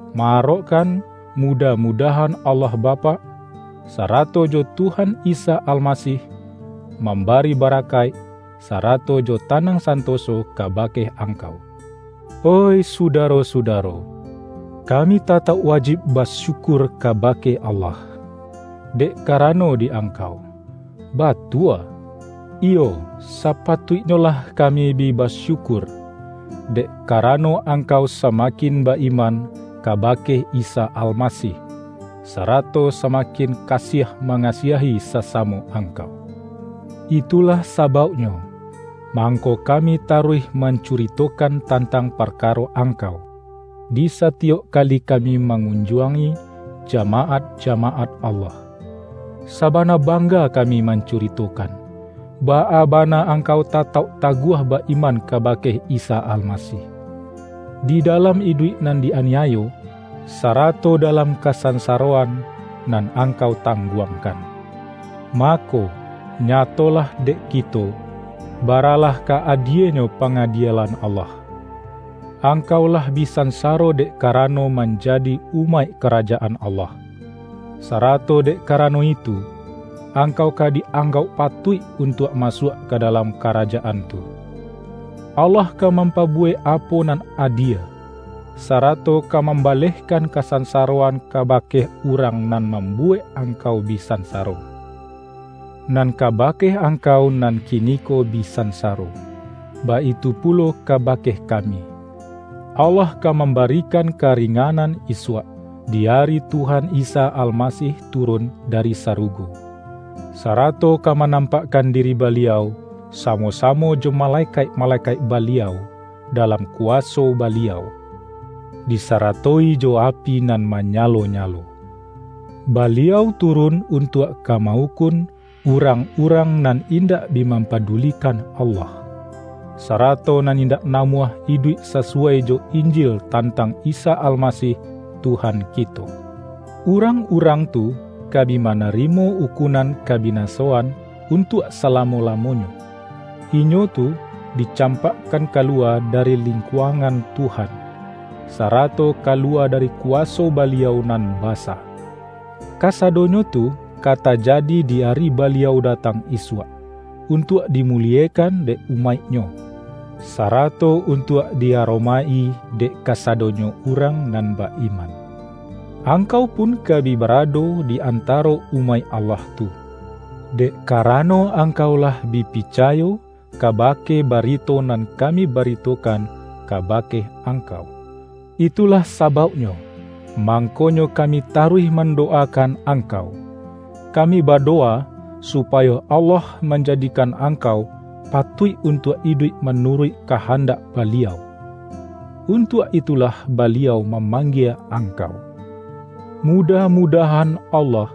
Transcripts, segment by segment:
ma-arokkan mudah-mu-dahan Allah Bapak, sarato jo Tuhan Isa Almasih, mambari barakaik sara-to jo tanang santoso kabake angkau. Oih sudaro-sudaro, kami tatauk wajib basyukur kabake Allah dek ka-rano di angkau. Batua, iyo sapatuik-nyolah kami bi basyukur, dek karano angkau samakin ba-iman kabake Isa Almasih, sarato samakin kasiah ma-ngasiahi sasamo angkau. Itulah sa-bauknyo, mangko kami taruih man-curitokan tantang parkaro angkau, di satiyok kali kami mangunjuangi ja-maat-jamaat Allah. Sabana bangga kami mancuritokan, baa bana ang-kau tatauk taguah ba-iman kabake Isa Almasih, di dalam iduik nan di-aniayo, sarato dalam kasansaroan nan angkau tangguangkan. Mako, nyatolah dek kito, bara-lah ka adienyo pangadielan Allah: Angkau lah bi sansaro dek karano manjadi umaik Karajaan Allah, sa-rato dek karano itu, angkau ka di-anggauk patuik untuak masuak ka dalam Karajaan tu. Allah ka mam-pabuwek apo nan adie, sarato ka mambalehkan kasansaroan kaba-ke urang nan mambuwek angkau bi sansaro. Nan kabake angkau nan kiniko bi sansaro — baitu pulo ka-bake kami — Allah ka mambarikan karinganan isuak, di ari Tuhan Isa Almasih turun dari sarugo, sarato ka manampakkan diri Baliau samo-samo jo malekaik-malekaik Baliau, dalam kuwaso Baliau, disarato-i jo api nan manyalo-nyalo. Baliau turun untuak ka ma-ukun urang-urang nan indak bi mampadulikan Allah, sarato nan indak namuah iduik sasuwai jo Injil tantang Isa Almasih Tuhan ki-to. Urang-urang tu ka bi manarimo ukunan kabinasoan untuak salamo-lamonyo, inyo tu dicampakkan ka lu-wa dari lingkuangan Tuhan, sarato ka luwa dari kuwaso Baliau nan ba-sa; kasadonyo tu ka tajadi di ari Baliau datang isuak, untuak dimu-liekan dek umaik-Nyo, sarato untuak di aromaik-i dek kasadonyo urang nan ba-iman. Angkau pun ka bi ba-rado di antaro umaik Allah tu, dek karano angkau lah bi picayo kaba-ke barito nan kami baritokan kaba-ke angkau. Itulah sabauknyo, mangkonyo ka-mi taruih mandowakan angkau. Ka-mi badowa supayo Allah manjadikan angkau patuik untuak iduik manu-ruik kahandak Baliau; untuak itulah Baliau mamanggie angkau. Mudah-mudahan Allah,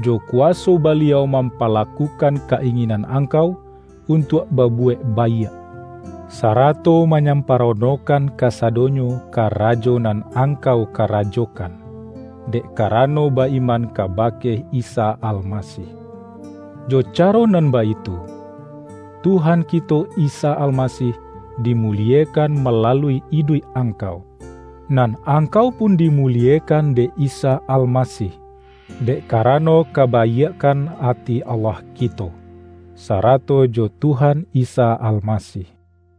jo kuwaso Baliau mampalakukan ka-inginan angkau untuak babuwek baiak, sarato ma-nyamparonokan kasadonyo karajo nan angkau karajokan, dek karano ba-iman kabake Isa Almasih. Jo ca-ro nan baitu, Tuhan kito Isa Almasih dimuliekan malalui iduik angkau, nan angkau pun dimuliekan dek Isa Almasih, dek karano kabaiakkan ati Allah kito, sarato jo Tuhan Isa Almasih.